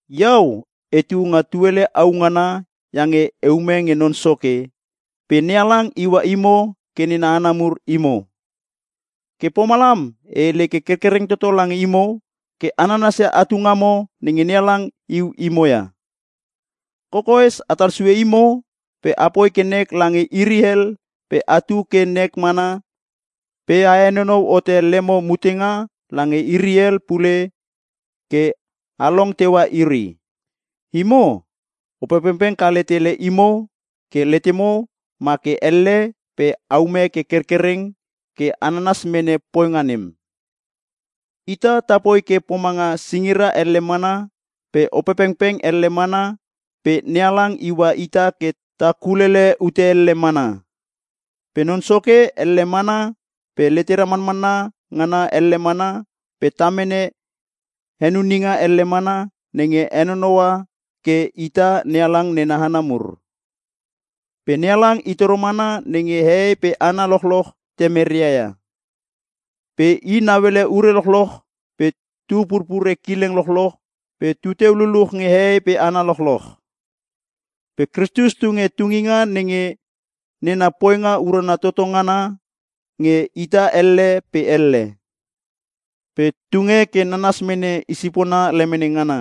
Iau etu nga tuele au ngana iange e ume nge Non Soke, pe NeHalang iua imo ke nena hana mur imo. Ke pomalam e hele ke kerkereng toto lange imo ke a nanasia atu ngamo nenge NeHalang iu imo ia. Kokoes atal sue imo pe apoi ke nek lange iri hel pe atu ke nek mana pe a henonou hote lemo mutenga lange iri hel pule ke a long teua iri. Imo, Opepengpeng kale tele imo ke letemo ma ke elle pe aume ke kerkereng ke a nanas mene poinga nem. Ita ta poi ke pomanga singira elle mana pe Opepengpeng elle mana pe NeHalang iua ita ke ta kulele ute elle mana. Pe Non Soke elle mana pe letera manmanna ngana elle mana pe ta mene henuninga elle mana nenge henonoua ke ita NeHalang nena hana mur. Pe NeHalang i toro mana nenge hehei pe hana lochloch Temeria ia, pe i nauele ure lochloch pe tu purpure kileng lochloch pe tu teu luluch nge hehei pe hana lochloch. Pe Kristus tunge tunginga nenga nena poinga urana toto ngana nge ita elle pe elle. Pe tunge ke nanas mene i sipona lemene ngana.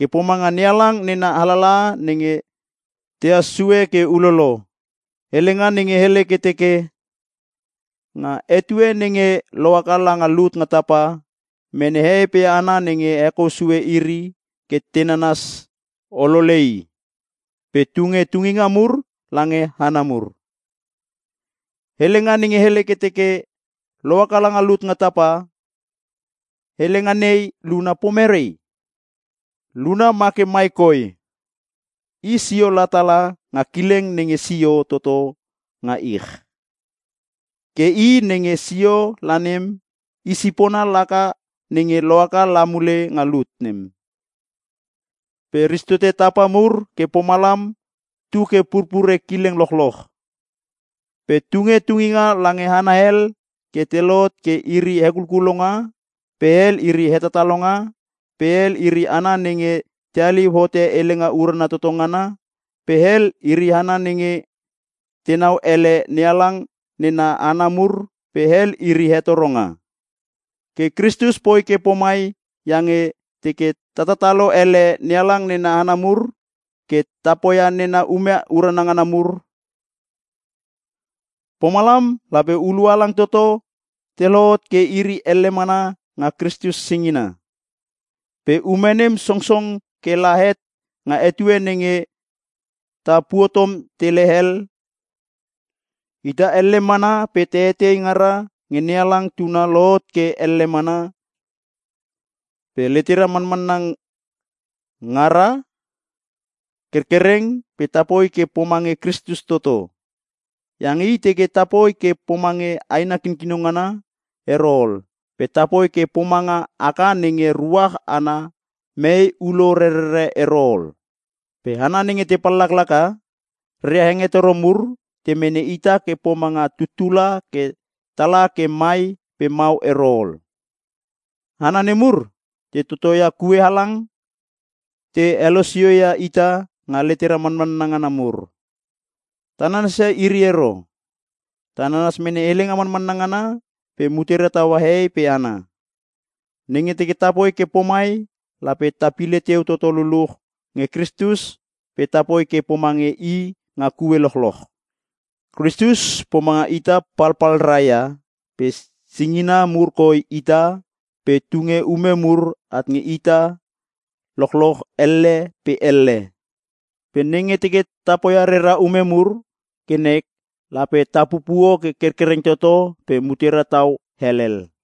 Ke pomanga NeHalang nena alalaha nenge tehas sue ke ulolo, hele ngana nenge hele ke teke, “Nga etue nenge lohaka langa lut nga tapa, mene hehei pe hana nenge hekou sue iri ke te nanas olole i. Pe tunge tunginga mur lange hana mur.” Helenga nenge hele ke teke, “Lohaka langa lut nga tapa” helenga nei luna pomerei? Luna ma ke mai koi: I sio la tala nga kileng nenge sio toto nga ich. Ke i nenge sio la nem, i sipona laka nenge lohaka la mule nga lut nem. Pe ristote tapa mur ke pomalam tu ke purpure kileng lochloch. Pe tunge tunginga lange hana hel ke te lohot ke iri hekulkulonga pe hel iri hetatalonga pe hel iri hana nenge te haliu hote helenga urana toto ngana pe hel iri hana nenge tenau ele NeHalang nena hana mur pe hel iri hetoronga. Ke Kristus poi ke pomai iange teke tatalo ele NeHalang nena hana mur ke te poia nena ume urana ngana mur. Pomalam lape hulua halang toto te lohot ke iri elle mana nga Kristus singina. Pe ume nem songong ke la het nga etue nenge ta puotom tele hel ke ita elle mana pe ta etei ngara nge NeHalang Tuna lohot ke elle mana, pe letera manmanna ngara kerkereng pe tapoi ke pomange Kristus toto. Iange I teke tapoi ke pomange aina kikino ngana ero ol pe tapoi ke pomanga aka nenge ruach ana mee ulo rerere ero ol. Pe hana nenge te pallaklaka, reria hengetoro mur te mene ita ke pomanga tuttula ke tala ke mai pe mau ero ol. Hana nemur te totoia kue halang ke te teke te helosio ia ita nga letera manmanna ngana mur. Ta nanas ia iri ero. Ta nanas mene helenga manmanna ngana pe mutera taua hehei pe hana. Nenge teke tapoi ke pomai lape ta pile teu toto luluch nge Kristus pe ta poi ke pomange I nga kue lochloch. Kristus pomanga ita palpalra ia pe singina mur koi ita pe tunge ume mur at nge ita lochloch elle pe elle. Pe nenge teke ta poia rera ume mur ke nek lape ta pupuo ke kerkereng toto pe mutera tau helhel.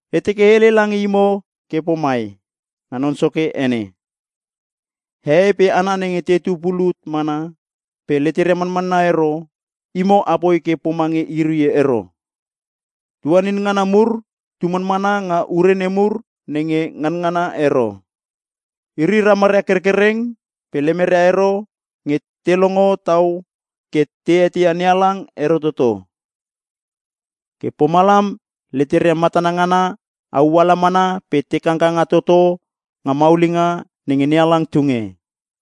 E teke e hele lange imo ke pomai nga Non Soke ene: Hehei pe hana nenge tetu pulut mana pe leteria manmanna ero, imo apoi ke pomange iri ero. Iri leteria tuanin ngana mur tu manmana nga ure nemur nenge nganangana ero. Iri ramaria kerkereng pe lemeria ero nge te longo tau ke te eteia NeHalang ero toto. Ke pomalam leteria matana ngana auala mana pe te kangkanga toto nga maulinga nenge NeHalang tunge.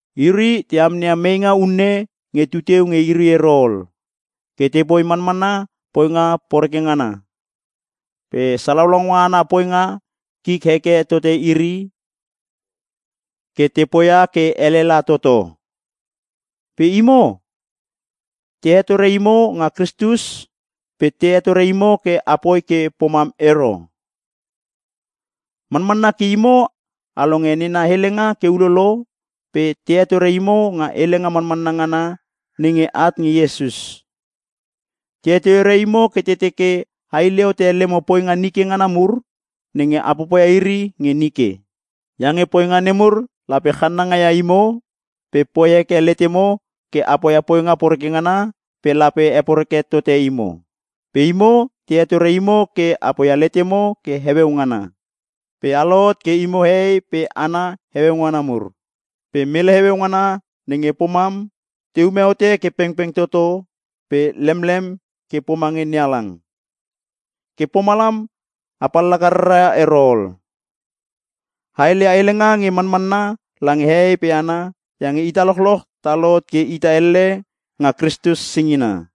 Iri te amneia meinga unne nge tu teu nge iri ero ol, ke tepoi manmana poinga poreke ngana. Pe salaunga ana poinga kik heke tote iri ke te poia ke ele la toto. Pe imo, te hetore imo nga Kristus pe te hetore imo ke apoi ke pomam ero. Manmanna ke imo a longe nena helenga ke ulolo pe te hetore imo nga helenga manmanna ngana nenge at nge Iesus. Te hetore imo ke te teke a hile hote lemo poinga nike ngana mur nenge a popoia iri nge nike. Iange poinga nemur lape channanga ia imo pe poi heke letemo ke a poia poinga poreke ngana pe lape heporeke tote imo. Pe imo te hetore imo ke a poia letemo ke heueu ngana pe a lohot ke imo hehei pe hana heueu ngana mur. Pe mele heueu ngana nenge pomam te ume hote ke pengpeng toto pe lemlem ke pomange NeHalang. Ke pomalam a pallaka rara ero ol. A heleia helenga nge manmanna lange hehei pe hana iange ita lochloch ta lohot ke ita elle nga Kristus singina.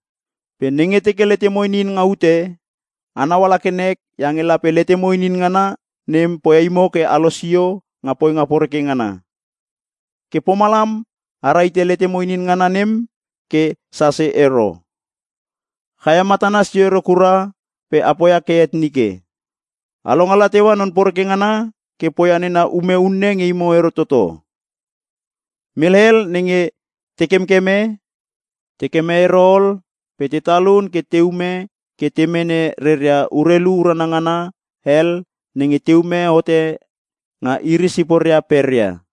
Pe nenge teke letemo inin nga ute, a nauala ke nek iange lape letemo inin ngana nem poia imo ke a losio nga poinga poreke ngana. Ke pomalam a rahite letemo inin ngana nem ke sase ero. Chaia matana sio ero kura pe a poia ke het nike. A longala teua non poreke ngana ke poia nena ume unne nge imo ero toto. Mele hel nenge te kemkeme, te keme ero ol pe te talun ke te ume ke te mene reria urelu urana ngana hel nenge te ume hote nga iri siporia peria.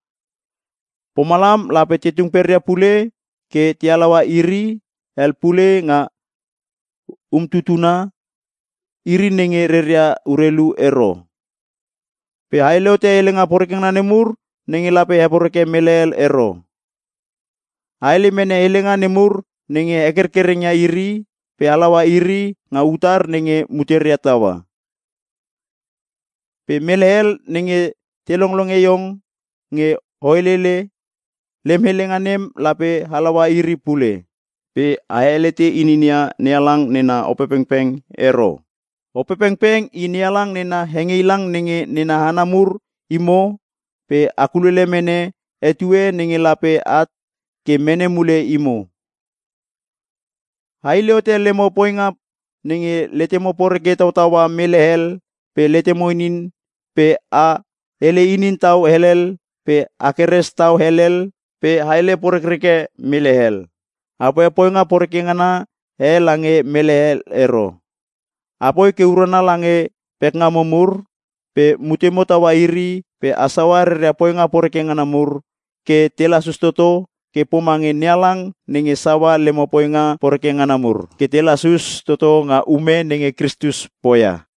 Pomalam lape te tung peria pule ke te halaua iri hel pule nga umtutuna, iri nenge reria urelu ero. Pe a hele hote helenga poreke ngana nemur nenge lape heporeke mele hel ero. A hele mene helenga nemur nenge hekerkereng ia iri pe halaua iri nga utar nenge muteria taua. Pe mele hel nenge te longlonge iong nge o helele, lem helenga nem lape halaua iri pule. Pe a helete ininia NeHalang nena Opepengpeng ero. Opepengpeng i NeHalang nena hengeilang nenge nena hana mur imo pe a kulele mene etue nenge lape at ke mene mule imo. A hile hote lemo poinga nenge letemo poreke tautaua mele hel pe letemo ininin pe a hele inin tau helel pe a keres tau helel pe a hele porekreke mele hel. A poia poinga poreke ngana e lange mele ero. Apoi ke urana lange pekngamo mur pe mutemo taua iri pe a saua reria poinga poreke ngana mur ke te lasus toto ke pomange NeHalang nge saua lemo poinga poreke ngana mur ke te lasus toto nga ume nenge Kristus poia.